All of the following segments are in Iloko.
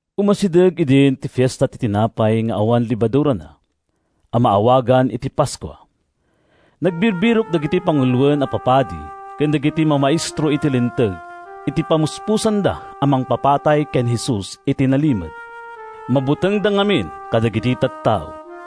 Umasideg idin ti Fiesta ti Tinapay nga awan Lebadurana, a maawagan iti Paskua. Nagbirbirok dagiti panguloen a papadi ken dagiti mamaestro iti Linteg iti pamuspusanda a mangpapatay ken Jesus iti nalimed. Mabutengda ngamin kadagiti tattao.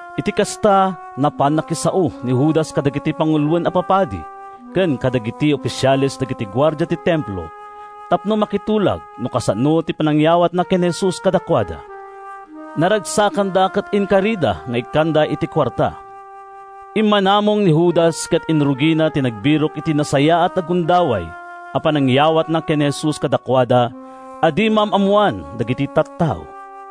Iti kasta, napan nakisao ni Judas kadagiti panguloen a papadi ken kadagiti ofisiales dagiti guardia ti Templo tapno makitulag no kasano ti panangyawatna ken ni Jesus kadakuada. Naragsakanda ket inkarida nga ikkan iti kuarta. Immanamong ni Judas ket inrugina ti nagbirok iti nasayaat a gundaway a panangyawatna ken ni Jesus kadakuada a di maam-ammoan dagiti tattao.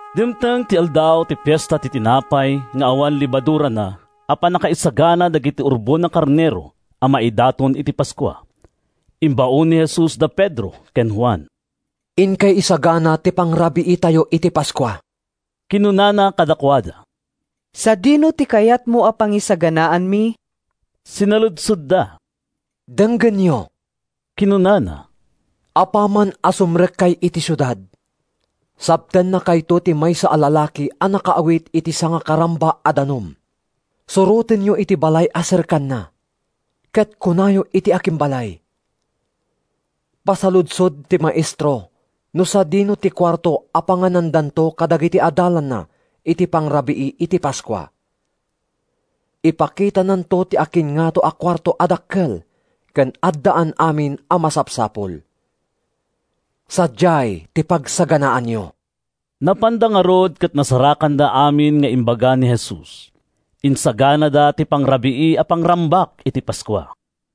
Dimteng ti aldaw ti Fiesta ti Tinapay nga awan Lebadurana a pannakaisagana dagiti urbon a karnero a maidaton iti Paskua. Imbaon ni Jesus da Pedro ken Juan. “Inkay isagana ti pangrabiitayo iti Paskua,” kinunana kadakuada. “Sadino ti kayatmo a pangisaganaanmi?” sinaludsodda. “Denggenyo!” kinunana. “Apaman a sumrekkay iti siudad, sabtennakayto ti maysa a lalaki a nakaawit iti sangakaramba a danum. Surotenyo iti balay a serkanna, ket kunayo iti akimbalay, ‘Pasaludsod ti Maestro no sadino ti kuarto a panganandanto kadagiti adalanna iti pangrabii iti Paskua.’ Ipakitananto ti akinngato a kuarto a dakkel ken addaan amin a masapsapul. Sadiay ti pagsaganaanyo.” Napanda ngarud ket nasarakanda amin nga imbaga ni Jesus. Insaganada ti pangrabii a pangrambak iti Paskua.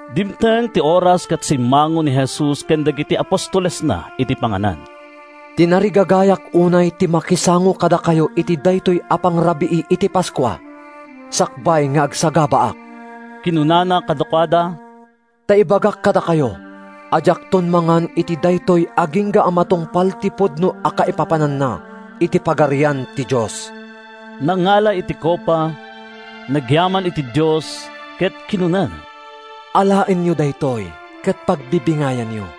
Dimteng ti oras ket simmango ni Jesus ken dagiti apostolesna iti panganan. “Tinarigagayak unay ti makisango kadakayo iti daytoy a pangrabii iti Paskua sakbay nga agsagabaak,” kinunana kadakuada. “Ta ibagak kadakayo a diakton mangan iti daytoy agingga a matungpal ti pudno a kaipapananna iti Pagarian ti Dios.” Nangala iti kopa, nagyaman iti Dios, ket kinunana, “Alaenyo daytoy ket pagbibingayanyo.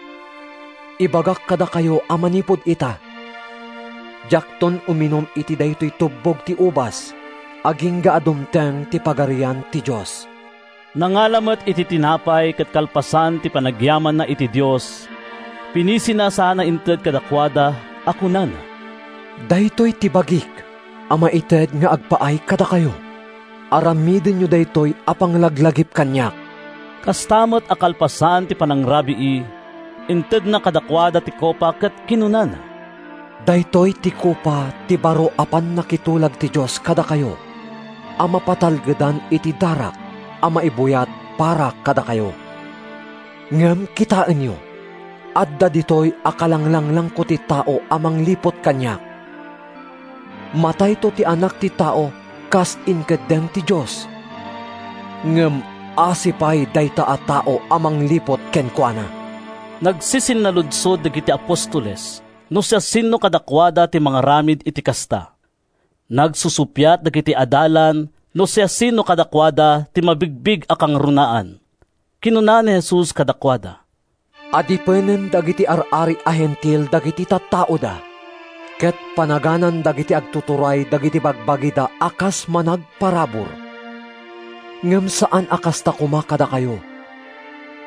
Ibagak kadakayo a manipud ita, diakton uminum iti daytoy tubbog ti ubas agingga a dumteng ti Pagarian ti Dios.” Nangala met iti tinapay ket kalpasan ti panagyamanna iti Dios, pinisina sana inted kadakuada a kunana, “Daytoy ti bagik a maited nga agpaay kadakayo. Aramidenyo daytoy a panglaglagip kaniak.” Kasta met a kalpasan ti panangrabii, intedna kadakuada ti kopa ket kinunana, “Daytoy ti kopa ti baro a pannakitulag ti Dios kadakayo a mapatalgedan iti darak a maibuyat para kadakayo. “Ngem kitaenyo! Adda ditoy a kalanglanglangko ti tao a mangliput kaniak. Matayto ti Anak ti Tao kas inkeddeng ti Dios, ngem asi pay dayta a tao a mangliput kenkuana!” Nagsisinnaludsod dagiti apostoles no siasino kadakuada ti mangaramid iti kasta. Nagsusuppiat dagiti adalan no siasino kadakuada ti mabigbig a kangrunaan. Kinuna ni Jesus kadakuada, “Adipenen dagiti ar-ari a Hentil dagiti tattaoda, ket panaganan dagiti agtuturay dagiti bagbagida a kas managparabur. Ngem saan a kasta koma kadakayo,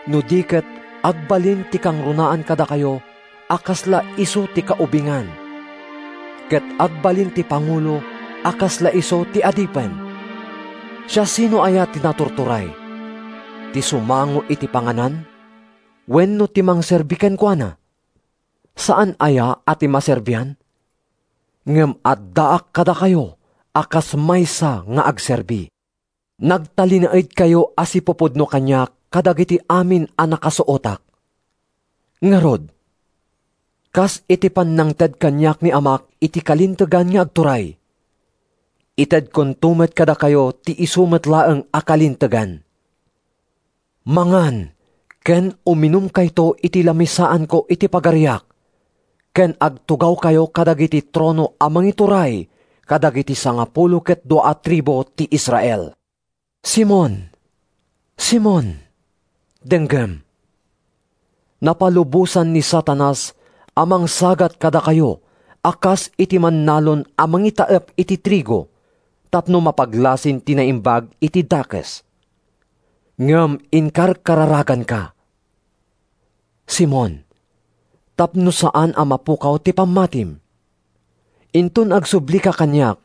no di ket agbalin ti kangrunaan kadakayo a kasla isu ti kaubingan, ket agbalin ti pangulo a kasla isu ti adipen. Siasino aya ti naturturay, ti sumango iti panganan wenno ti mangserbi kenkuana? Saan aya a ti maserbian? Ngem addaak kadakayo a kas maysa nga agserbi. “Nagtalinaedkayo a sipupudno kaniak kadagiti amin a nakasuotak. Ngarud, kas iti pannangted kaniak ni Amak iti kalintegan nga agturay, itedkonto met kadakayo ti isu met laeng a kalintegan. Mangan ken uminumkayto iti lamisaanko iti Pagariak ken agtugawkayo kadagiti trono a mangituray kadagiti sangapulo ket dua a tribu ti Israel.” “Simon, Simon, denggem! Napalubosan ni Satanas a mangsagat kadakayo a kas iti mannalon a mangitaep iti trigo tapno mapaglasin ti naimbag iti dakes. Ngem inkarkararaganka, Simon, tapno saan a mapukaw ti pammatim. Inton agsublika kaniak,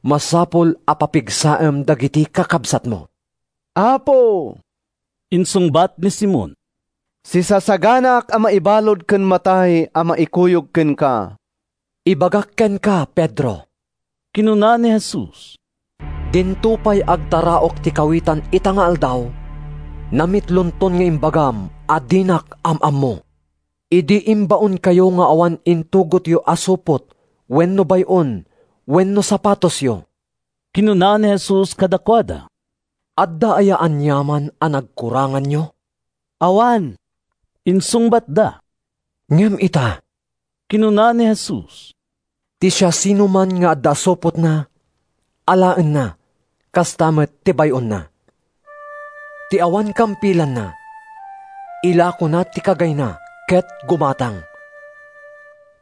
masapul a papigsaem dagiti kakabsatmo.” “Apo,” insungbat ni Simon, “sisasaganaak a maibalud ken matay a maikuyog kenka.” “Ibagak kenka, Pedro,” kinuna ni Jesus, “dinto pay agtaraok ti kawitan ita nga aldaw, namitlonton nga imbagam a dinak am-ammo.” “Idi imbaonkayo nga awan intugotyo a supot wenno bay-on wenno sapatosyo,” kinuna ni Jesus kadakuada, “adda aya aniaman a nagkuranganyo?” “Awan,” insungbatda. “Ngem ita,” kinuna ni Jesus, “ti siasinoman nga adda supotna, alaenna, kasta met ti bay-onna. Ti awan kampilanna, ilakona ti kagayna ket gumatang.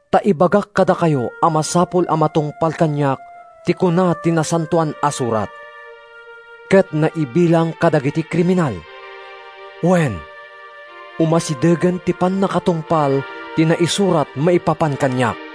Ta ibagak kadakayo a masapul a matungpal kaniak ti kuna ti Nasantoan a Surat: ‘Ket naibilang kadagiti kriminal.’ Wen, umasidegen ti pannakatungpal ti naisurat maipapan kaniak.”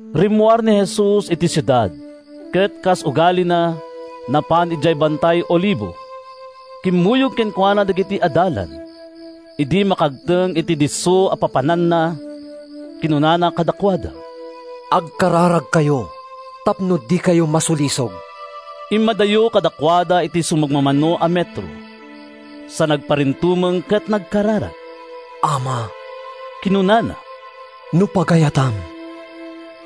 Rimmuar ni Jesus iti siudad, ket kas ugalina, napan idiay Bantay Olivo; kimmuyog kenkuana dagiti adalan. Idi makagteng iti disso a pappapananna, kinunana kadakuada, “Agkararagkayo tapno dikayo masulisog.” Immadayo kadakuada iti sumagmamano a metro, sa nagparintumeng ket nagkararag. “Ama,” kinunana, “no pagayatam,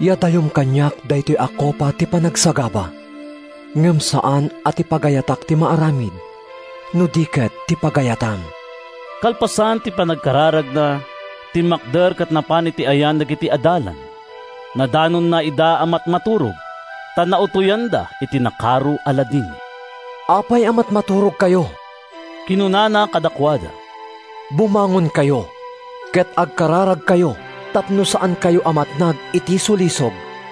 yadayom kaniak daytoy a kopa ti panagsagaba. Ngem saan a ti pagayatak ti maaramid, no di ket ti pagayatam.” Kalpasan ti panagkararagna, timmakder ket napan iti ayan dagiti adalan. Nadanonna ida a matmaturog, ta nautoyanda iti nakaro a ladingit. “Apay a matmaturogkayo?” kinunana kadakuada. “Bumangonkayo ket agkararagkayo tapno saankayo a matnag iti sulisog.”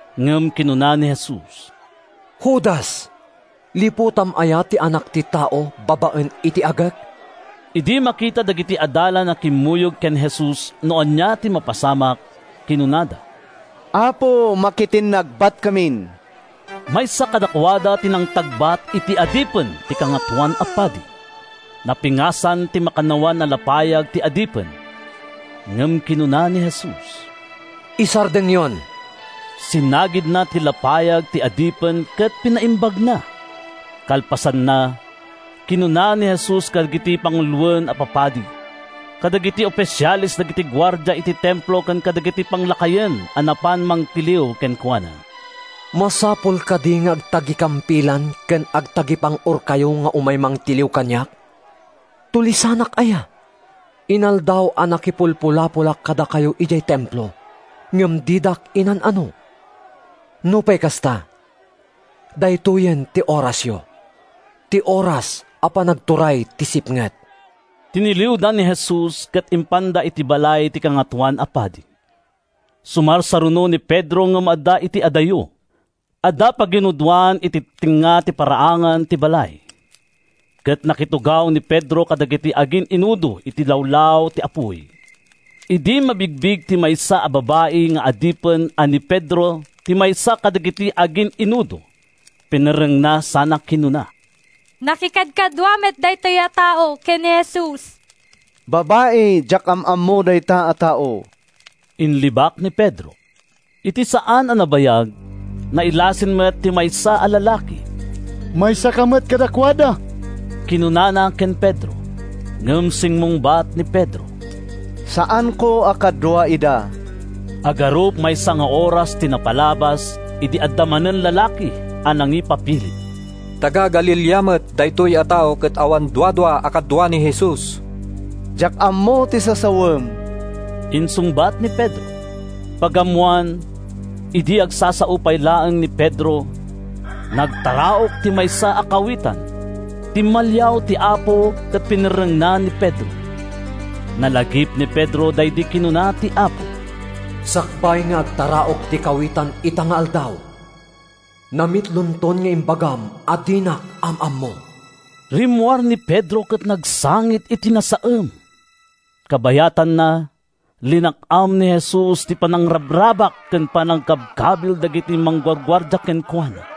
ngem kinuna ni Jesus: “Judas, liputam aya ti Anak ti Tao babaen iti agek?” Idi makita dagiti adalan a kimmuyog ken Jesus no ania ti mapasamak, kinunada, “Apo, makitinnagbatkamin?” Maysa kadakuada ti nangtagbat iti adipen ti Kangatoan a Padi. Napingasan ti makannawan a lapayag ti adipen. Ngem kinuna ni Jesus, “Isardengyon!” Sinagidna ti lapayag ti adipen ket pinaimbagna. Kalpasanna, kinuna ni Jesus kadagiti panguloen a papadi, kadagiti ofisiales dagiti guardia iti Templo ken kadagiti panglakayen a napan nangtiliw kenkuana: “Masapul kadi nga agtagikampilan ken agtagipang-orkayo nga umay mangtiliw kaniak? Tulisanak aya? Inaldaw a nakipulpulapolak kadakayo idiay Templo, ngem didak inan-ano. Nupay kasta, daytoyen ti orasyo—ti oras a panagturay ti sipnget.” Tiniliwda ni Jesus ket impanda iti balay ti Kangatoan a Padi. Sumarsaruno ni Pedro ngem adda iti adayo. Adda paginudoan iti tengnga ti paraangan ti balay, ket nakitugaw ni Pedro kadagiti agin-inudo iti lawlaw ti apuy. Idi mabigbig ti maysa a babai nga adipen a ni Pedro ti maysa kadagiti agin-inudo, pinerrengna sana kinuna, “Nakikadkadua met daytoy a tao ken ni Jesus!” “Babai, diak am-ammo dayta a tao!” inlibak ni Pedro. Iti saan a nabayag, nailasin met ti maysa a lalaki. “Maysaka met kadakuada,” kinunana ken Pedro. Ngem simmungbat ni Pedro, “Saanko a kadua ida!” Agarup maysa nga oras ti napalabas idi adda manen lalaki a nangipapilit: “Taga-Galilea met daytoy a tao ket awan duadua a kadua ni Jesus!” “Diak ammo ti sasawem!” insungbat ni Pedro. Pagammoan, idi agsasao pay laeng ni Pedro, nagtaraok ti maysa a kawitan. Timmaliaw ti Apo ket pinerrengna ni Pedro. Nalagip ni Pedro daydi kinuna ti Apo: “Sakbay nga agtaraok ti kawitan ita nga aldaw, namitlonton nga imbagam a dinak am-ammo.” Rimmuar ni Pedro ket nagsangit iti nasaem. Kabayatanna, linak-am ni Jesus ti panangrabrabak ken panangkabkabil dagiti mangguguardia kenkuana.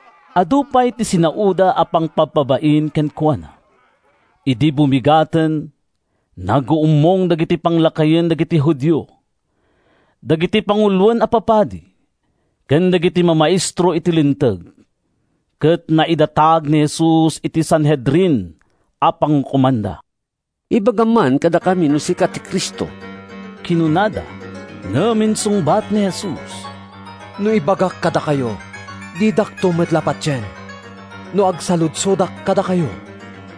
Adu pay ti sinaoda a pangpabpabain kenkuana. Idi bumigaten, naguummong dagiti panglakayen dagiti Judio, dagiti panguloen a papadi, ken dagiti mamaestro iti Linteg, ket naidatag ni Jesus iti Sanhedrin a pangukomanda. “Ibagam man kadakami no sika ti Cristo?” kinunada. Ngem insungbat ni Jesus, “No ibagak kadakayo, didakto met la patien. No agsaludsodak kadakayo,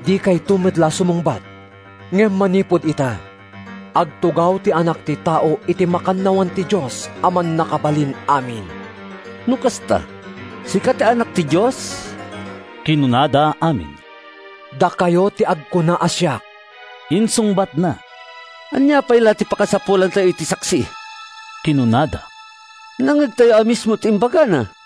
dikayto met la sumungbat. Ngem manipud ita, agtugaw ti Anak ti Tao iti makannawan ti Dios a Mannakabalin-amin.” “No kasta, sika ti Anak ti Dios?” kinunada amin. “Dakayo ti agkuna a siak,” insungbatna. “Ania pay la ti pakasapulantayo iti saksi?” kinunada. “Nangngegtayo a mismo ti imbagana.”